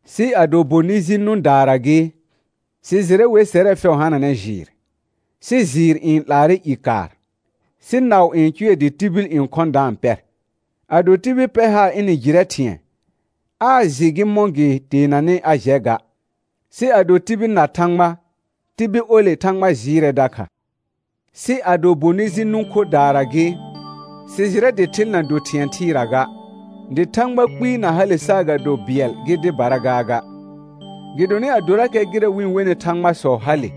Sɩ ado bonɩ ji nʋ̃daara gɩ, sɩ jɩrɛ wer sɛrɛ fɛʋ hananɛ jɩɩr, sɩ jɩɩr n 'laarɛ i kaar, sɩ naʋ n cʋɛ dɩ tibil n khɔ̃ da-n pɛr. Ado tibil pɛr haar ɩnɩ jɩrɛ thɩ̃ɛ, aa jɩ gɩ mɔ̃ gɩ teenanɩ a jɛ ga. Sɩ ado tibil na Thãgba, tibil ole Thãgba jɩɩrɛ dakha. Sɩ ado bonɩ ji nʋ̃ khodaara gɩ, sɩ jɩrɛ dɩ thɩl na do thɩ̃ɛ thɩɩra ga, dɩ thãgba kpɩɩ na hale saagado bɩɛl gɩ dɩbara gaaga. Gɩdonɩ adorakɛ gɩrɛ wɩ-n wenɩ thãgbasɔ hale,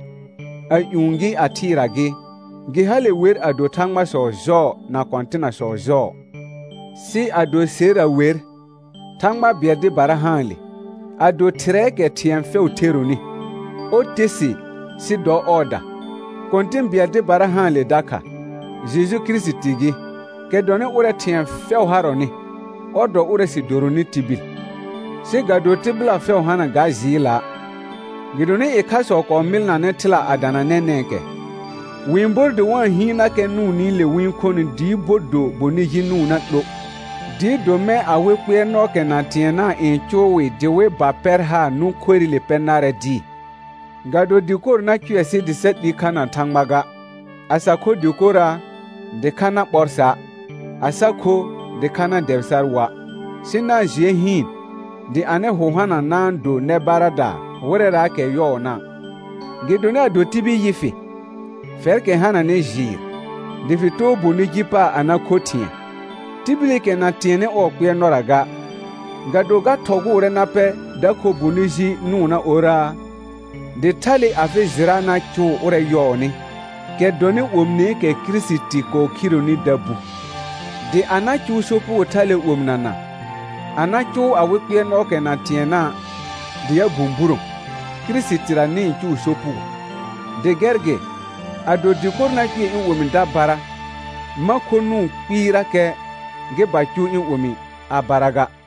a ƴũ gɩ a thɩɩra gɩ, gɩ hale wer a do thãgbasɔ jɔɔ na kɔ̃tɩnasɔ jɔɔ. Sɩ ado serra wer, Thãgba bɩɛl dɩbara haanle, a do Thɩrɛɛkɛ thɩ̃ɛ fɛʋ theronɩ, ɔr te sɩ sɩ dɔ ɔɔda. Kɔ̃tɩ̃ bɩɛl dɩbara haanle dakha, Jeju Kirisiti gɩ, kɛ dɔnɩ ʋrɛ thɩ̃ɛ fɛʋ harɔnɩ, ɔr dɔ ʋrɛ sɩ doronɩ tibil. Sɩ ga do tɩbɩla fɛʋ hana ga jɩɩla'; gɩdonɩ ɩkhasɔ kɔɔ mɩlnanɛ thɩla a dana nɛnɛ̃kɛ, wɩ-n bor dɩ wa-n hɩɩnnakɛ nʋʋnɩle wɩ-n khonɩ dɩɩ bo do bonɩ ji nʋʋnna 'lo, dɩɩ do mɛ̃ awɩ kpɩɛrnɔɔkɛ na tɩɛnna' n cʋʋ wɩ dɩ wɩ ba pɛr haar nʋ̃ khorɩle pɛ narɛ dɩɩ. Ga do dɩkor na cʋɛ sɩ dɩ sa 'li kha na Thãgba ga. A sa kho dɩkora', dɩkha na ɓɔr sa'; a sa kho, dɩkha na-n dɛbɩ sar woa'. Sɩ na-n jɩɛ hɩɩn, dɩ anɩ hʋ hana na-n do nɛ baradaa wɩrɛraakɛ yɔɔna'. Gɩdonɩ ado tibil yɩ fɩ, fɛrkɛ hananɩ jɩɩr, dɩ fɩ too bonɩ ji paar a na kho thɩ̃ɛ, tibilikɛ na tɩɛnnɩ ɔɔ kpɩɛrnɔra ga, ga do ga thɔgʋʋrɛ na pɛr da kho bonɩ ji nʋʋnna orraa? Dɩ thale afɩ jɩra na cʋʋ ʋrɛ yɔɔnɩ, kɛ dɔnɩ omineekɛ Kirisiti kɔɔ khironi, da bu. Dɩ a na cʋʋ sopugo thale omɩnana, a na cʋʋ awɩ kpɩɛrnɔɔkɛ na tɩɛnna', dɩ a bũburõ, Kirisitira nɩ-n cʋʋ sopugo. Dɩ gɛr gɩ, ado dɩkor na cʋɛ ɩ̃ omi da bara, ma kho nʋʋn kpɩɩrakɛ, gɩ ba cʋʋ ɩ̃ omi a bara ga.